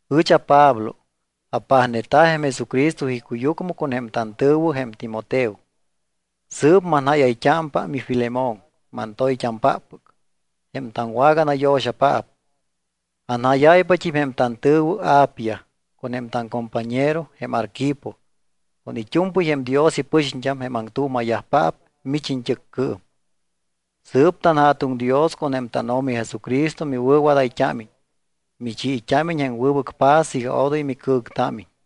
Ɨch aPablo, apajneta̱ jém Jesucristo icuyucmɨ, con jém tantɨ̱wɨ, jém Timoteo, sɨɨp manjáyayt́ámpa miFilemón, mantoyt́ampáppɨc, jém taŋwaganayo̱xapaap. Anjáyáypat́im jém tantɨ̱wɨ, Apia, con jém taŋcompañero jém Arquipo con it́u̱mpɨy jém Dios ipɨxiñt́am, jém aŋtuuma̱yajpaap mich iñt́ɨccɨɨm. Sɨɨp tanJa̱tuŋ Dios con jém tánO̱mi Jesucristo miwɨ̱wadayt́ámiñ, michiit́ámiñ jém wɨbɨc paz iga odoy micɨ̱ŋtámiñ.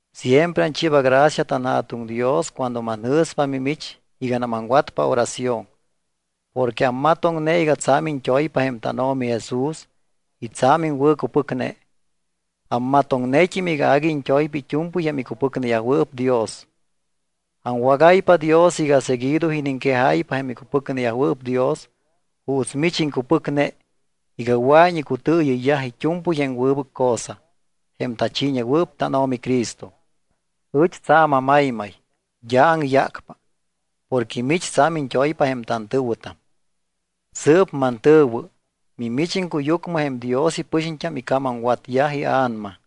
Siempre anchiiba gracia tanJa̱tuŋ Dios cuando manjɨ̱spa mimich iganam aŋwatpa oración. Porque ammatoŋne iga tsa̱m iñt́oypa jém tánO̱mi Jesús y tsa̱m iŋwɨ̱cupɨcne. Ammatoŋnet́im iga agui iñt́oypa it́u̱mpɨy jém icupɨcneyajwɨɨp Dios. Aŋwagáypa Dios iga seguido iniŋquejáypa jém icupɨcneyajwɨɨp Dios juuts mich iŋcupɨcne iga wɨa̱iñ icutɨɨyɨyyaj it́u̱mpɨy jém wɨbɨc cosa, jém tachiiñewɨɨp tánO̱mi Cristo. Ɨch tsa̱m amaymay, d́a aŋyácpa, porque mich tsa̱m iñt́oypa jém tantɨ̱wɨtam. Sɨɨp mantɨ̱wɨ, mimich iŋcuyucmɨ jém Dios ipɨxiñt́am ica̱mamwatyaj ia̱nama.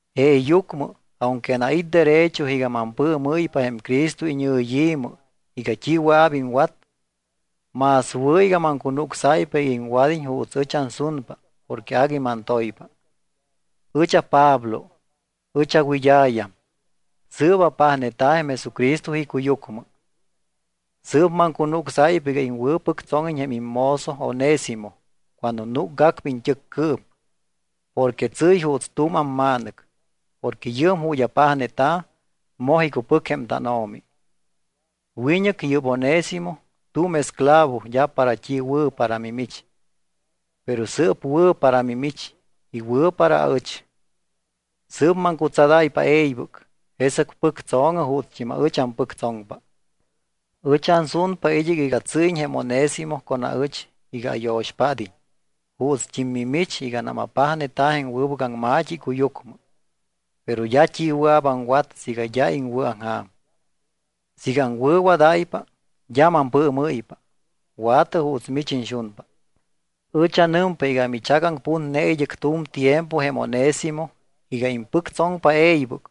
Jeeyucmɨ, aunque anait́ derecho iga mampɨɨmɨ́ypa jém Cristo iñɨyi̱mɨ iga t́i wɨa̱p iŋwat, más wɨ̱ iga maŋcunucsáypa iga iŋwad́iñ juuts ɨch ansunpa porque agui mantoypa. Ɨch aPablo, ɨch awɨd́a̱yam, sɨɨp apajneta̱ jém Jesucristo icuyucmɨ. Sɨɨp maŋcunucsáypa iga iŋwɨ̱pɨctsóŋiñ jém immozo Onésimo cuando núcgacpa iñt́ɨccɨɨm porque tsɨ́y juuts tu̱m amma̱nɨc, porque yɨɨm ju̱t́ apajneta̱, moj icupɨc jém tánO̱mi. Wiñɨc yɨ́p Onésimo tu̱m esclavo d́a para t́i wɨ̱ para mimich. Pero sɨɨp wɨ̱ para mimich y wɨ̱ para aɨch. Sɨɨp maŋcutsadáypa e̱ybɨc, jesɨc pɨctso̱ŋɨ juutst́im aɨch ampɨctsoŋpa. Ɨch ansunpa id́ɨc iga tsɨ́yiñ jém Onésimo con aɨch iga ayo̱xpád́iñ juutst́im mimich iganam apajneta̱ jém wɨbɨc aŋma̱t́i icuyucmɨ. Pero d́a t́i wɨa̱p aŋwat siiga d́a iŋwɨ̱aŋja̱m. Siiga aŋwɨ̱wadáypa, d́a mampɨɨmɨ́ypa. Wa̱tɨ juuts mich iñxunpa. Ɨch anɨmpa iga michagaŋputne id́ɨc tu̱m tiempo jém Onésimo iga impɨctsoŋpa e̱ybɨc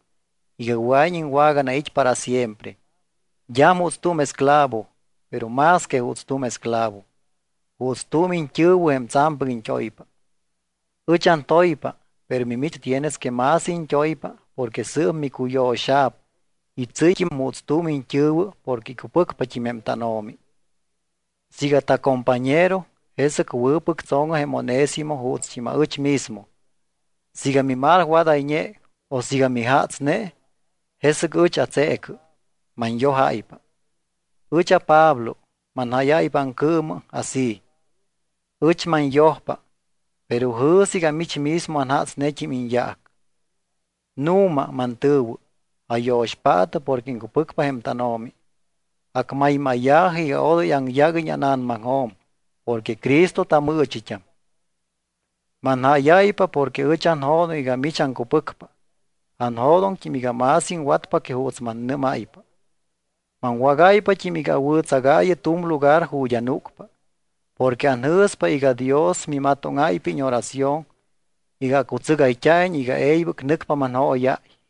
iga wɨa̱iñ iŋwaganait́ para siempre. D́am juuts tu̱m esclavo, pero más que juuts tu̱m esclavo, juuts tu̱m iñt́ɨ̱wɨ jém tsa̱mpɨc iñt́oypa. Ɨch antoypa, pero mimich tienes que más iñt́oypa porque sɨɨp miwɨ̱cuyo̱xa̱p y tsɨ́yt́im juuts tu̱m iñt́ɨ̱wɨ porque icupɨcpat́im jém tánO̱mi. Siiga tacompañero, jesɨc wɨ̱pɨctso̱ŋɨ jém Onésimo juutst́im aɨch mismo. Siiga mimalwadayñe o siiga mijatsne, jesɨc ɨch atseecɨ, manyojáypa. Ɨch aPablo manjáyáypa aŋcɨɨmɨ así: Ɨch manyojpa. Pero jɨ̱sɨ iga mich mismo anjatsnet́im iñyaac. Nu̱ma, mantɨ̱wɨ, ayo̱xpaatɨ porque iŋcupɨcpa jém tánO̱mi. Acmaymáya̱jɨ iga odoy aŋyáguiñ ána̱namaŋjo̱m porque Cristo tamɨɨchit́am. Manjáyáypa porque ɨch anjo̱doŋ iga mich aŋcupɨcpa. Anjo̱doŋt́im iga más iŋwatpa que juuts mannɨ́máypa. Maŋwágáypat́im iga awɨ̱tsagaayɨ tu̱m lugar ju̱t́ anúcpa. Porque anjɨ̱spa iga Dios mimatóŋáypa íñoración iga acutsɨgayt́a̱iñ iga e̱ybɨc nɨcpa manjóyáy.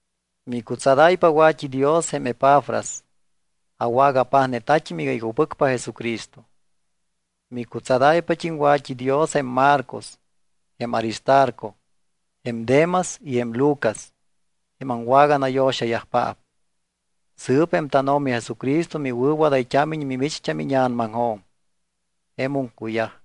Micutsadáypa wa̱t́idios jém Epafras, awagapajneta̱t́im iga icupɨcpa Jesucristo. Micutsadáypat́im wat́idios jém Marcos, jém Aristarco, jém Demas y jém Lucas, jém aŋwaganayo̱xayajpaap. Sɨɨp jém tánO̱mi Jesucristo miwɨ̱wadayt́ámiñ mimicht́am íña̱namaŋjo̱m. Jemum cuyaj.